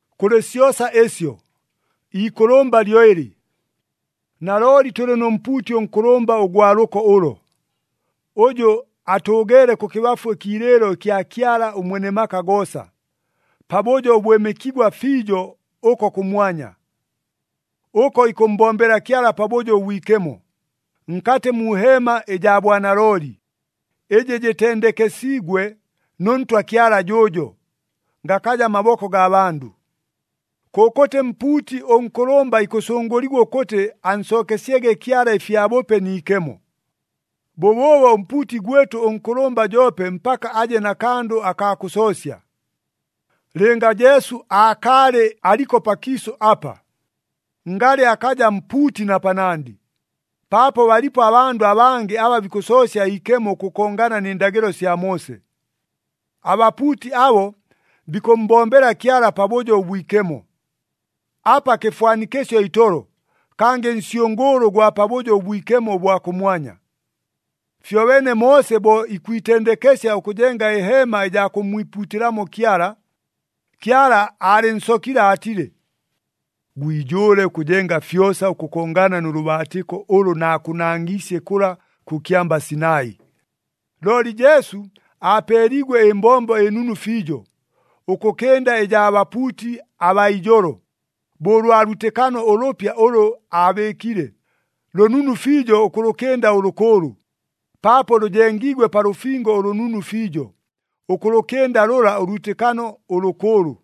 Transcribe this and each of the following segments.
Kʉlɨ syosa ɨsyo, iikʉlʉmba lyo ɨlɨ. Nalooli tʉlɨ nʉ mpuuti ʉnkʉlʉmba ʉgwa lʉko ʉlo, ʉjʉ atʉʉgeele kʉkɨbafu ɨkiilɨɨlo ɨkya Kyala ʉMwene maka goosa, pabʉjo ʉbwɨmɨkigwa fiijo ʉko kʉmwanya. Ʉko ikʉmmbombela Kyala Pabʉjo ʉBwikemo, nkatɨ mu heema ɨjaa bwanalooli, ɨjɨ jɨtendekesiigwe nʉ Ntwa Kyala jʉʉjo, gakaja maboko gaa bandʉ. Kʉkʉtɨ mpuuti ʉnkʉlʉmba ikʉsʉngʉligwa ʉkʉtɨ ansookesyege Kyala ɨfyabʉpe ni ikemo. Bʉbʉʉbo ʉmpuuti gwɨtʉ ʉnkʉlʉmba joope mpaka aje na kandʉ akaa kʉsoosya. Lɨnga Jesu aakaalɨ aliko pakiisʉ apa, ngalɨ akaja mpuuti na panandɨ, paapo balipo abandʉ abangɨ aba bikʉsoosya iikemo ʉkʉkongana nɨ ndagɨlo sya Moose. Abapuuti abo bikʉmmbombela Kyala Pabʉjo ʉBwikemo, apa kɨfwanikɨsyo itolo, kangɨ nsyʉngʉʉlʉ ʉgwa Pabʉjo ʉBwikemo ʉbwa kʉmwanya. Fyobeene Moose bo ikwitendekesya ʉkʉjenga ɨheema ɨjaa kʉmmwipuutɨlamo Kyala, Kyala aalɨnsokile aatile, “Gwijʉʉle ʉkʉjenga fyosa ʉkʉkongana nʉ lʉbaatɨko ʉlʉ naakʉnangiisye kʉla kʉ kyamba Sinai.” Looli Jesu aapeeliigwe ɨmbombo ɨnunu fiijo, ʉkʉkɨnda ɨjaa bapuuti abaa ijolo, bo ʉlwa lwitɨkano ʉlʉpya ʉlʉ aabɨɨkile, lʉnunu fiijo ʉkʉlʉkɨnda ʉlʉkʉʉlʉ, paapo lʉjengiigwe pa lʉfingo ʉlʉnunu fiijo, ʉkʉlʉkɨnda lʉla ʉlwitɨkano ʉlʉkʉʉlʉ.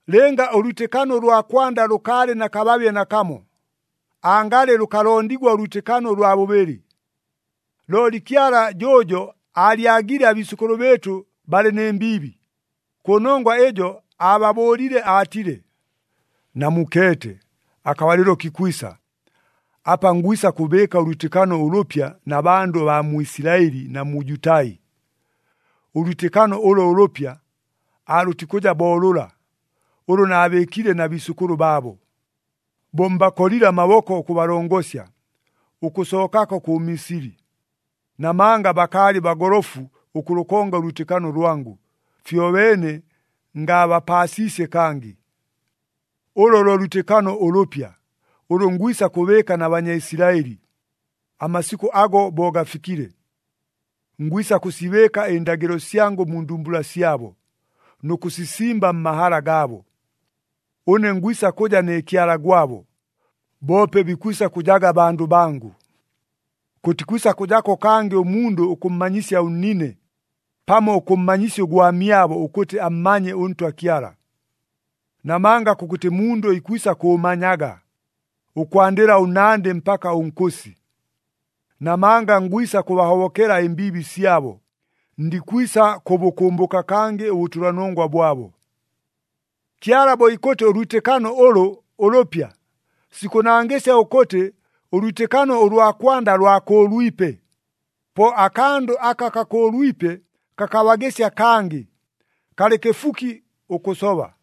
Lɨnga ʉlwitɨkano ʉlwa kwanda lʉkaalɨ na kababye nakamo, angalɨ lʉkalondigwa ʉlwitɨkano ʉlwa bʉbɨlɨ. Looli Kyala jʉʉjo aalyagile abiisʉkʉlʉ bɨɨtʉ balɨ nɨ mbiibi. Kʉnongwa ɨjo aababʉʉlile aatile, “Namukeete, akabalɨlo kikwisa, apa ngwisa kʉbɨɨka ʉlwitɨkano ʉlʉpya na bandʉ abaa mu Isilaɨli na mu Jutai. Ʉlwitɨkano ʉlo ʉlʉpya, aalʉtikʉja bo lʉla, ʉlʉ naabɨɨkile na biisʉkʉlʉ baabo, bo mbakolile amaboko ʉkʉbalongosya, ʉkʉsookako kʉ Misili. Namanga bakaalɨ bagolofu ʉkʉlʉkonga ʉlwitɨkano lwangʉ, fyobeene ngaabapaasiisye kangɨ. Ʉlʉ lo lwitɨkano ʉlʉpya, ʉlʉ ngwisa kʉbɨɨka na Banyaisilaɨli, amasikʉ ago bo gafikile. Ngwisa kʉsibɨɨka ɨndagɨlo syangʉ mu ndumbula syabo, nʉ kʉsisimba mmahala gaabo. Ʉne ngwisa kʉja ne Kyala gwabo, boope bikwisa kʉjaga bandʉ bangʉ. Kʉtikwisa kʉjako kangɨ ʉmundʉ ʉkʉmmanyisya ʉnnine, pamo ʉkʉmmanyisya ʉgwamyabo ʉkʉtɨ ammanye ʉNtwa Kyala. Namanga kʉkʉtɨ mundʉ ikwisa kʉʉmanyaga, ʉkwandɨla ʉnnandɨ mpaka ʉnkʉsi. Namanga ngwisa kʉbahobokela ɨmbiibi syabo, ndikwisa kʉbʉkʉmbʉka kangɨ ʉbʉtʉlanongwa bwabo.” Kyala bo ikʉtɨ ʉlwitɨkano ʉlʉ, “Ʉlʉpya,” sikʉnangɨsya ʉkʉtɨ ʉlwitɨkano ʉlwa kwanda lwakʉʉlwipe. Po akandʉ aka kakʉʉlwipe kakabagɨsya kangɨ, kalɨ kɨfuki ʉkʉsoba.